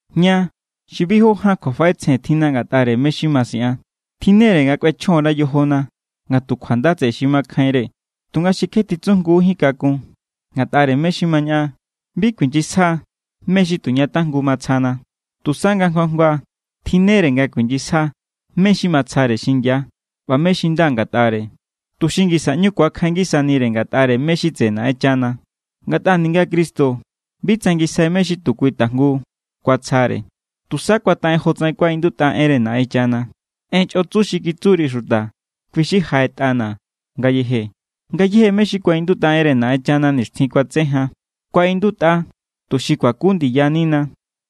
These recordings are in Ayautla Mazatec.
Ña xi bi jó ján kjuafaꞌetsjen tjinna ngatꞌare mé= xi ma siꞌan, tjinnere nga kꞌuechjon_ra yojona nga tu kjuanda tseꞌe xi makjainre tunga xi kje titsujngu kakun ngatꞌare mé= xi ma ñaꞌan. Bi kuinyisja mé= xi tu ña tajngu matsjana. Tusa nga jngu jngua tjinnere nga kuinyisja mé= xi matsjare xingia ꞌba mé= xi nda ngatꞌare, tuxi ngisa ꞌñu ku̱akjain ngisanire ngatꞌare mé= xi tseꞌe Naꞌenchana. Ngatꞌa ninga Cristo bi tsangisjai mé= xi tu kui tajngu kuatsjare. Tusa kuataꞌen jotsaꞌen kuaꞌindutꞌa enre Naꞌenchana: “En chꞌotsu xi kitsuri xuta, kui= xi jaꞌetꞌana̱ ngayeje.” Ngayéje mé= xi kuaꞌindutꞌa enre Naꞌenchana nixtjin kuatse jan, kuaꞌindutꞌa tuxi kuaku ndiyanina.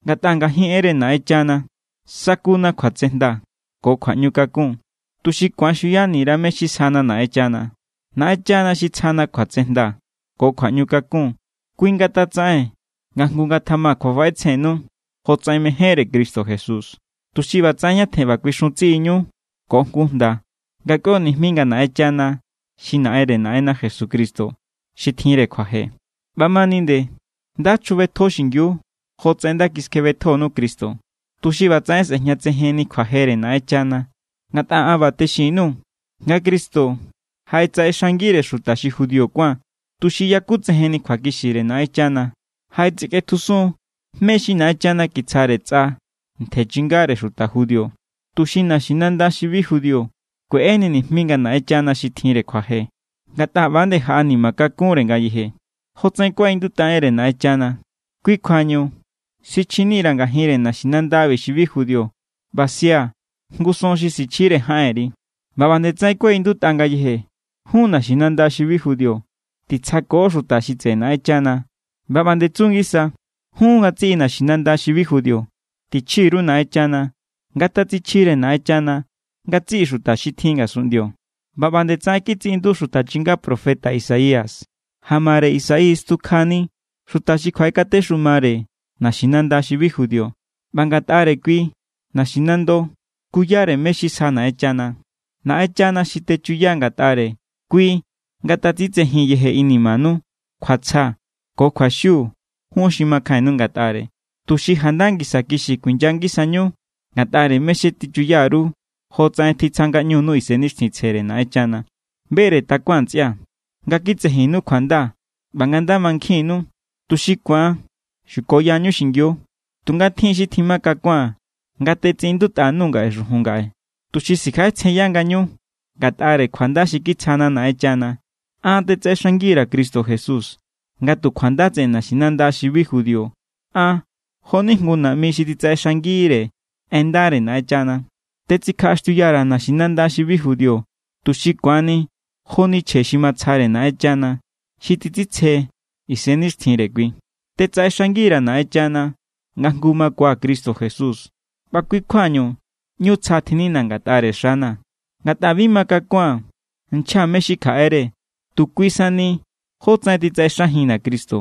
Ngatꞌa ngajin enre Naꞌenchana sakuna kjuatsejnda ko kjuaꞌñukakun, tuxi ku̱an xuyani_ra mé= xi sjana Naꞌenchana. Naꞌenchana xi tsjana kjuatsejnda ko kjuaꞌñukakun, kui ngatatsaꞌen nga jngu ngatjama kjuafaꞌetsjennu jotsaꞌen mejénre Cristo Jesús. Tuxi ꞌbatsaꞌen ñatjen ꞌba kuixun tsiꞌiñu ko jngu jnda nga kꞌuio nijmi nga Naꞌenchana xi Naꞌenre Naꞌenna Jesucristo xi tjinre kjuaje. ꞌBamani nde, nda chjubetjo xingiu jotsaꞌen nda kiskjebetjonu Cristo, tuxi ꞌbatsaꞌen sꞌe̱jñatsejenni kjuajere Naꞌenchana. Ngatꞌa an ꞌba texin_nuu̱ nga Cristo jaꞌetsaꞌexangire xuta xi judío kuán, tuxi yakutsejenni kjuakixire Naꞌenchana. Jaꞌetsikꞌetjusun mé= xi Naꞌenchana kitsjare tsꞌa ntje chingare xuta judío, tuxi naxinanda xi bi judío kueꞌeni nijmi nga Naꞌenchana xi tjinre kjuaje. Ngatꞌa ꞌba=nde jaꞌanima kakunre ngayeje. Jotsaꞌen kuaꞌindutꞌa enre Naꞌenchana: “Kui= kjuañu sichjinira̱ ngajinre naxinanda xi bi judío ꞌba sia̱ jngu son xi sichjire jaꞌenri.” ꞌBa ꞌba nde tsaꞌen kuaꞌindutꞌa ngayeje: “Jun naxinanda xi bi judío, titsjako xuta xi tseꞌe Naꞌenchana.” ꞌBa ꞌba nde tsu ngisa: “Jun ngatsiꞌi naxinanda xi bi judío, tichji_ru Naꞌenchana. Ngatatsichjire Naꞌenchana ngatsiꞌi xuta xi tjin ngasunꞌndio.” ꞌBa ꞌba nde tsaꞌen kitsiꞌindutꞌa xuta chinga profeta Isaías: “Jamare Isaí stjukjani xuta xi kjuaꞌekatexumare naxinanda xi bi judío, ꞌba ngatꞌare kui naxinando skuyare mé= xi sja Naꞌenchana.” Naꞌenchana xi techuya ngatꞌare, kui ngatatsitsejin yeje inimanu kjuatsja ko kjuaxiu jun xi makjainnu ngatꞌare, tuxi janda ngisa kixi kuinya ngisañu ngatꞌare mé= xi techuya_ru jotsaꞌen titsja ngaꞌñunu Isennixtjintsjere Naꞌenchana. Bere takuaa̱n, ntsꞌia̱, nga kitsejinnu kjuanda ꞌba nga nda mankjinnu, tuxi ku̱an xukoyañu xingiu. Tunga tjin= xi tjima kakua̱n nga tetsiꞌindutꞌa_nuu̱ xujun ngaꞌe, tuxi sikjaꞌetsjenya ngañu. Ngatꞌare kjuanda xi kitsjana̱ Naꞌenchana, an tetsaꞌenxangi_ra̱ Cristo Jesús nga tu kjuanda tseꞌe naxinanda xi bi judío. An jo=ni jngu naꞌmi xi titsaꞌexangire en ndare Naꞌenchana. Tetsikjaꞌaxtiuya_ra̱ naxinanda xi bi judío, tuxi ku̱anni joni chje xi matsjare Naꞌenchana, xi titsitsje Isennixtjintsjere kui. Tetsaꞌenxangi_ra̱ Naꞌenchana nga jngu makuaa̱ Cristo Jesús ꞌba kui= kjuañu ꞌñu tsja tjinnina̱ ngatꞌare xana̱. Ngatꞌa bi makakua̱n nchja mé= xi kjaꞌere, tu kui sani jótsaꞌen titsaꞌexajinna̱ Cristo,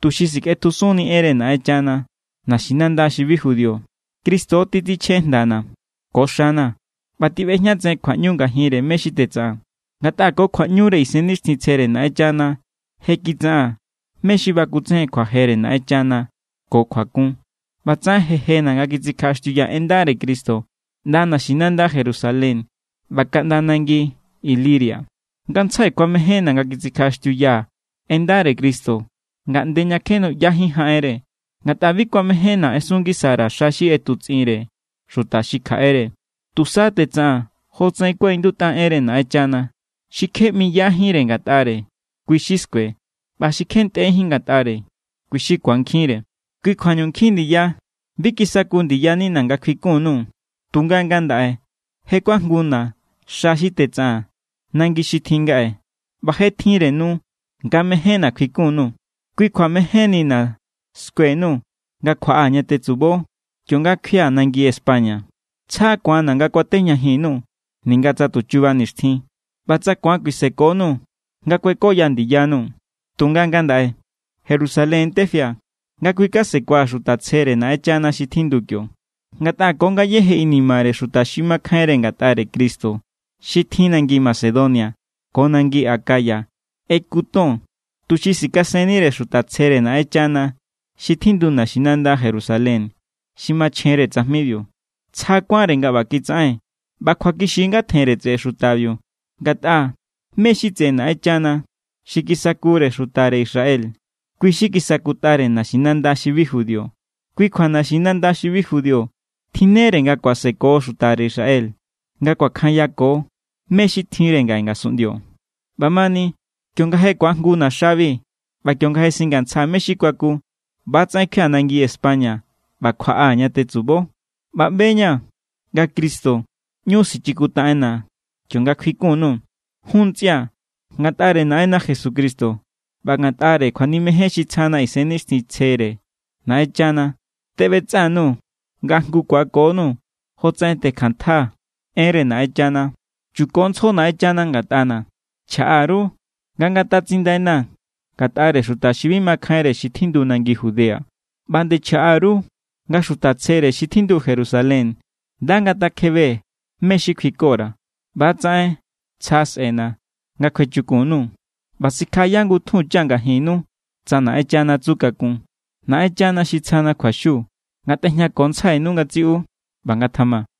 tuxi sikꞌetjusunni enre Naꞌenchana naxinanda xi bi judío. Cristo titsichjen jndana̱ ko xana̱ ꞌba tiꞌbejñatsejen kjuaꞌñu ngajinre mé= xi tetsaꞌaa̱n. Ngatꞌa ko kjuaꞌñure Isennixtjintsjere Naꞌenchana je kitsaꞌaa̱n mé= xi bakutsejen kjuajere Naꞌenchana ko kjuakun. ꞌBatsaꞌen je jena̱ nga kitsikjaꞌaxtiuyaa̱ en ndare Cristo ꞌnda naxinanda Jerusalén ꞌba kaꞌnda nangi Iliria. Ngantsjai kuamejénna̱ nga kitsikjaꞌaxtiuyaa̱ en ndare Cristo ngaꞌnde ña kje nuꞌyajínre jaꞌenre. Ngatꞌa bi kuamejénna̱ ꞌesun ngisa_ra̱ xa xi ꞌetutsꞌinre xuta xi kjaꞌere. Tusa tetsaꞌaa̱n jotsaꞌen kuaꞌindutꞌa enre Naꞌenchana: Xi kje ꞌmiyajínre ngatꞌare, kui= xi skue. ꞌBa xi kje ntꞌejín ngatꞌare, kui= xi ku̱ankjinre. Kui= kjuañu nkjin ndiya bi kisaku ndiyanina̱ nga kjuikun_nuu̱. Tunga ngandaꞌe je= kuajnguna̱ xa xi tetsaꞌaa̱n nangi xi tjin ngaꞌe ꞌba je tjinre nu nga mejénna̱ kjuikun_nuu̱. Kui kjua mejénnina̱ skue_nuu̱ nga kjuaꞌaa̱ ña tetsubo, kionga kjuia̱ nangi España. Tsja ku̱anna̱ nga kuatejñajin_nuu̱ ninga tsa tu chuba nixtjin, ꞌba tsa ku̱an kuisekonuu̱ nga kuekoya ndiyanuu̱. Tunga ngandaꞌe Jerusalén= tefia̱ nga kjuikasekua̱ xuta tsjere Naꞌenchana xi tjindu kio. Ngatꞌa ko ngayéje inimare xuta xi makjainre ngatꞌare Cristo xi tjin nangi Macedonia ko nangi Acaya ꞌeku ton, tuxi sikasennire xuta tsjere Naꞌenchana xi tjindu naxinanda Jerusalén xi machjenre tsajmibiu. Tsja kuánre nga ꞌba kitsaꞌen. ꞌBa kjuakixi= nga tjenre tseꞌe xutabiu. Ngatꞌa mé= xi tseꞌe Naꞌenchana xi kisakure xutare Israel, kui= xi kisakutꞌare naxinanda xi bi judío. Kui kjua naxinanda xi bi judío tjinnere nga kuaseko xutare Israel nga kuakjanyako mé= xi tjinre ngaꞌe ngasunꞌndio. ꞌBamani kionga je ku̱ajnguna̱ xabi ꞌba kionga je singantsjaa̱ mé= xi kuaku, ꞌba=tsaꞌen kjuia̱ nangi España ꞌba kjuaꞌaa̱ ña tetsubo. ꞌBa ꞌbe=ña̱ nga Cristo ꞌñu sichikuntaꞌenna kionga kjuikun_nuu̱. Jun ntsꞌia̱, ngatꞌare Naꞌenna Jesucristo ꞌba ngatꞌare kjuanimejen xi tsjana Isennixtjintsjere Naꞌenchana teꞌbetsꞌa_nuu̱ nga jngu ku̱akonuu̱ jotsaꞌen tekjanntjaa̱ enre Naꞌenchana. Chukontsjo Naꞌenchana ngatꞌana̱. Chjaꞌa_ru nga ngatatsindaina̱ ngatꞌare xuta xi bi makjainre xi tjindu nangi Judea. ꞌBa nde chjaꞌa_ru nga xuta tsjere xi tjindu Jerusalén nda ngatakjebe mé= xi kjuiko_ra̱. ꞌBa=tsaꞌen, tsja sꞌe̱na̱ nga kjuechukun_nuu̱ ꞌba sikjaꞌaya ngutjunchaa̱ ngajinnu tsa Naꞌenchana tsu kakun. Naꞌenchana xi tsjana kjuaxiu ngatꞌejñakontsjainu ngatsiꞌu. ꞌBa ngatjama.